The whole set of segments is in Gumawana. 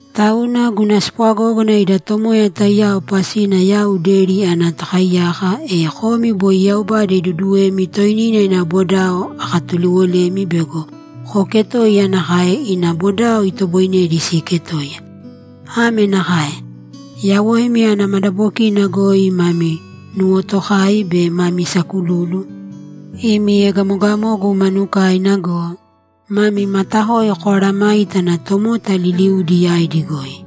Tauna, guna spwagógana ida Tomoya taiyao pasina yau deri ana tokaiyaka, e komi boi Yaubada iduuduwemi toinina ina bodao akatuliwolemi bego kooketōiya nakae ina bodao itoboinedi siiketoiya. Ame nakae: Yawoimi ana madabokina goi mami nuwotokai be mami sakululu, imi egamogamogu manukaina go, mami matakoi koaaramāitana tomota liliudi yaidi goi.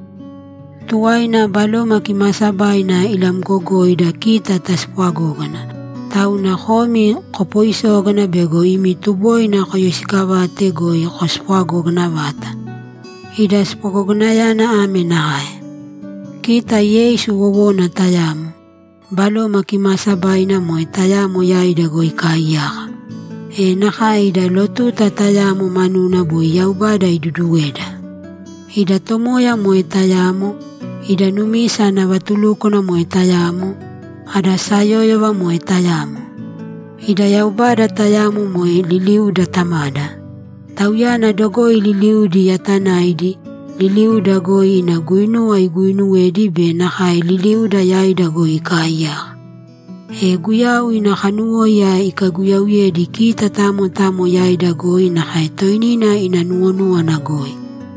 Tuwaina Baloma Kimaasabaina ilamgogoida kita taspwagógana, tauna komi kopoisōgana bego imi tuboina koyoisiikavate goi kospwagogana vata. Ida spwagoganayana ame nakae: Kita Yeisu wowona tayamo; Baloma Kimaasabaina moe tayamo yaida goi ikaaiyaka. E nakae ida lotuta tayamo manuna boi Yaubada iduduweda. Ida Tomoya moe tayamo; ida numisa ana vatulúkwana moe tayamo; ada sayóyova moe tayamo. Ida Yaubada tayamo moe liliuda Tamada. Tauyana dogoi liliudi yatanaidi, liliuda goi ina guinuwa iguuinuwedi be nakae liliuda yaida goi ikaaiyaka. E Guyau ina kanuwóiya ikaiguyauyedi kita tamo tamo yaida goi nakae toinina ina nuwonúwana goi.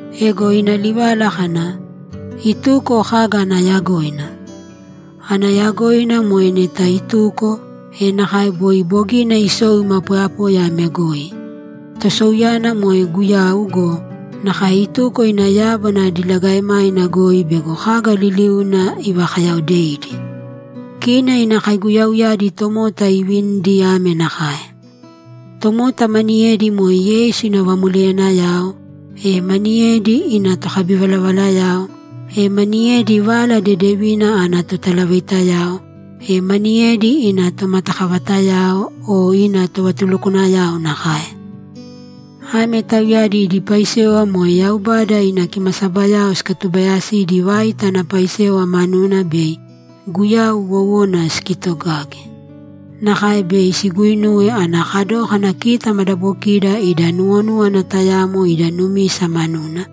Ego ina livala kana, ‘Ituko’ kaga ana yagoina? Ana yagoina moe neta ituko, e nakae boi bogina isou ima poyapoya ame goi. Tosouyana moe Guyau go, nakae ituko ina yábana diligaemaina goi bego kaga liliuna ivakayaodeidi. Kina ina kaiguyauyadi tomota iivinidi ame nakae: Tomota maniyedi moe Yeisu ina vamoleyanayao, e maniyedi ina tokabivalavalayao, e maniyedi Vala Dedevina ana totalavaitayao, e maniyedi ina tomatakavatayao o ina tovatulukwanayao nakae. Ame tauyadi idi paisewa moe Yaubada ina kimasabayao sikatubayasidi vaita ana paisewa manuna bei Guyau wowona sikitogage. Nakae bei siguuinuwe ana kadókana kita madabokida ida nuwonúwana tayamo ida numisa manuna,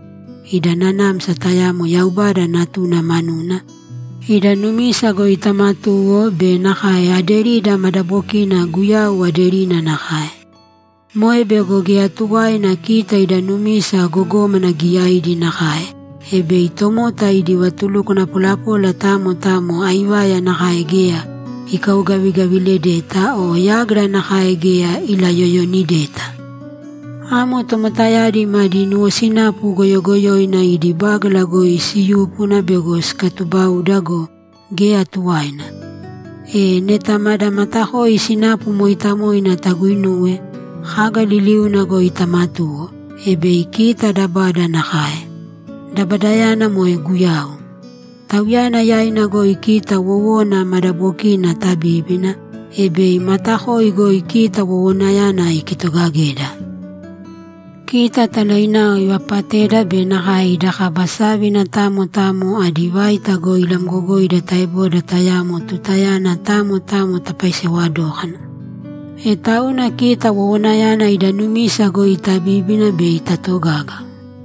ida nanamsa tayamo Yaubada Natuna manuna, ida numisa goi tamatuwo be nakae aderida madabokina Guyau aderina nakae. Moe bego geya tuwaina kita ida numisa gogómana giyaidi nakae, e bei tomota idi vatulukwana polapola tamo tamo aivaya nakae geya ikaugavigaviledeta o yágira nakae geya ilayoyonideta. Amo tomotayadi madi nuwosinapu goyogoyoina idi bágala goi siyúpuna bego sikatubauda go, geya tuwaina. E, neta mada matakoi sinapu mooitamoina taguuinuwe, kaga liliuna goi tamatūwo, e bei kita dabada nakae. Dabadayana moe Guyau. Tauyana yaina goi kita wowona madabokina tabíbina, e bei matakoi goi kita wowonayana ikitogageda. Kita talainao ivapateda be nakae ida kaba sávina tamo tamo adi vaita goi ilamgogoida taeboda tayamo tutayana tamo tamo tapaisewa dókana. E tauna kita wowonayana ida numisa goi tabíbina bei tatogaga.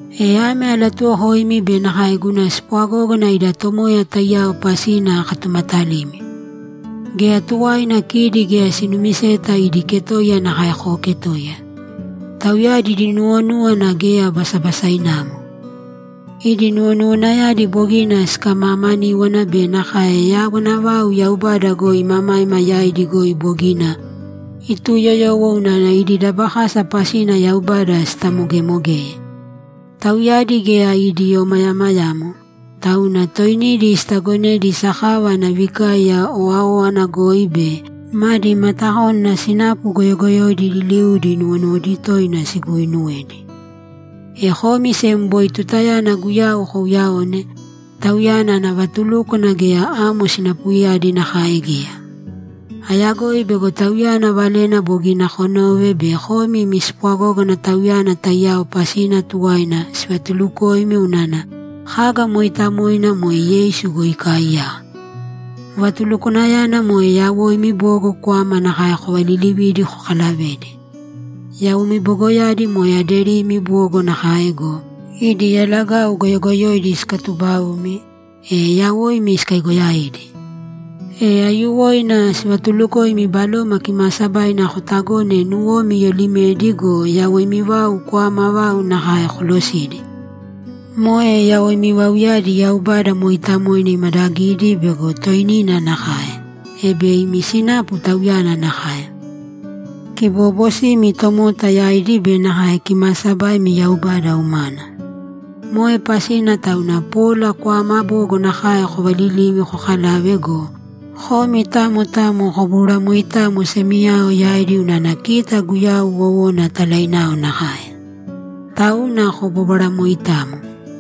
E ame alatuwokoimi be nakae guna spwagógana ida Tomoya taiyao pasina akatumatalimi: Geya tuwaina kidi geya sinumiseta idi ketoiya nakae kooketoiya. Tauyadi idi nuwonúwana geya basabasainamo. Idi nuwonuwanayadi bogina sikamamaníwana be nakae yawana vau Yaubada goi imamaima yaidi goi bogina ituyoyowo unana idi dabakasa pasina Yaubada sitamogemogeye. Tauyadi geya idi omayamayamo, tauna toinidi sitagonedi sakava ana vikaiya owáowana goi be madi matakónana sinapu goyogoyoidi liliudi nuwonuwodi toina siguuinuwedi. E komi sem boi tutayana Guyau kouyaone, Tauyana ana vatulúkwana geya amo sinapuyadi nakae geya. Ayagoi bego Tauyana valena bogina konove be komi imi spwagógana Tauyana taiyao pasina tuwaina sivatuulukoimi unana kaga mooitamoina moe Yeisu goi ikaaiyaka. Vatulukwanayana moe yawoimi bogo kwama nakae kovalilivīdi kokalavēdi. Yawoimi bogoyadi moe aderimi bogo nakae go, idi yalagau goyogoyoidi sikatubaumi, e yawoimi sikaigoyaidi. E aiyuwoina sivatulukoimi Baloma Kimaasabaina kotagōne nuwomi iyoolimedi go yawoimi vau kwama vau nakae kolosīdi. Moe yawoimi vauyadi Yaubada mooitamoina imadagidi bego toinina nakae, e bei imi sinapu Tauyana nakae: Kiboobosimi tomota yaidi be nakae kimaasabaimi Yaubada umana. Moe pasina tauna pola kwama bogo nakae kovalilīvi kokalāve go, komi tamo tamo kobōbwara moitamo semiyao yaidi unana kita Guyau wowona talainao nakae. Tauna kobōbwara moitamo.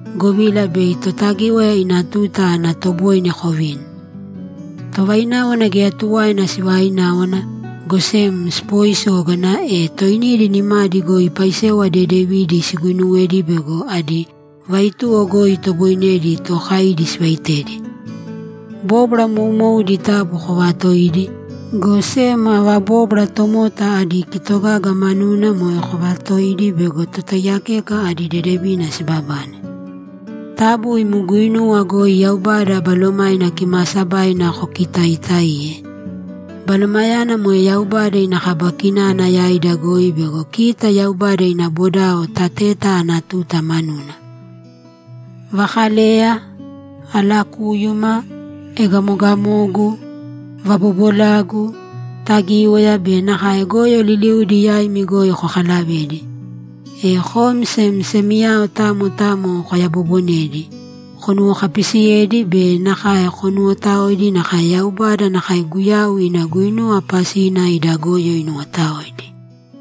govila bei Totagíwaya ina tuta ana toboine kovini. Tovaináwana geya tuwaina sivaināwana, go sem sipoisōgana, e toinidi nimadi goi paisewa dedevidi siguinuwēdi bego adi vaituwo goi itoboinedi tookaidi sivaitedi. Bóbwara moumoudi taabu koovatōidi, go sem ava bóbwara tomota adi kitogaga manuna moe kovatōidi bego totaiyakeka adi dedevina sibabane. Taabu imi guinuwa goi Yaubada Balomaina Kimaasabaina kokitaaitaīye. Balomayana moe Yaubada ina kaba kinana yaida goi bego kita Yaubada ina bodao tateta ana tuta manuna. Vakaleya, alakúyuma, egamogamogu, vabobolagu, tagíwaya be nakae goyo liliudi yaimi goi kokalavēdi. E komi sem semiyao tamo tamo koyabobonēdi, konuwokapisiyēdi be nakae konuwotaōidi nakae Yaubada nakae Guyau ina guinuwa pasina ida goyo inuwotaoidi.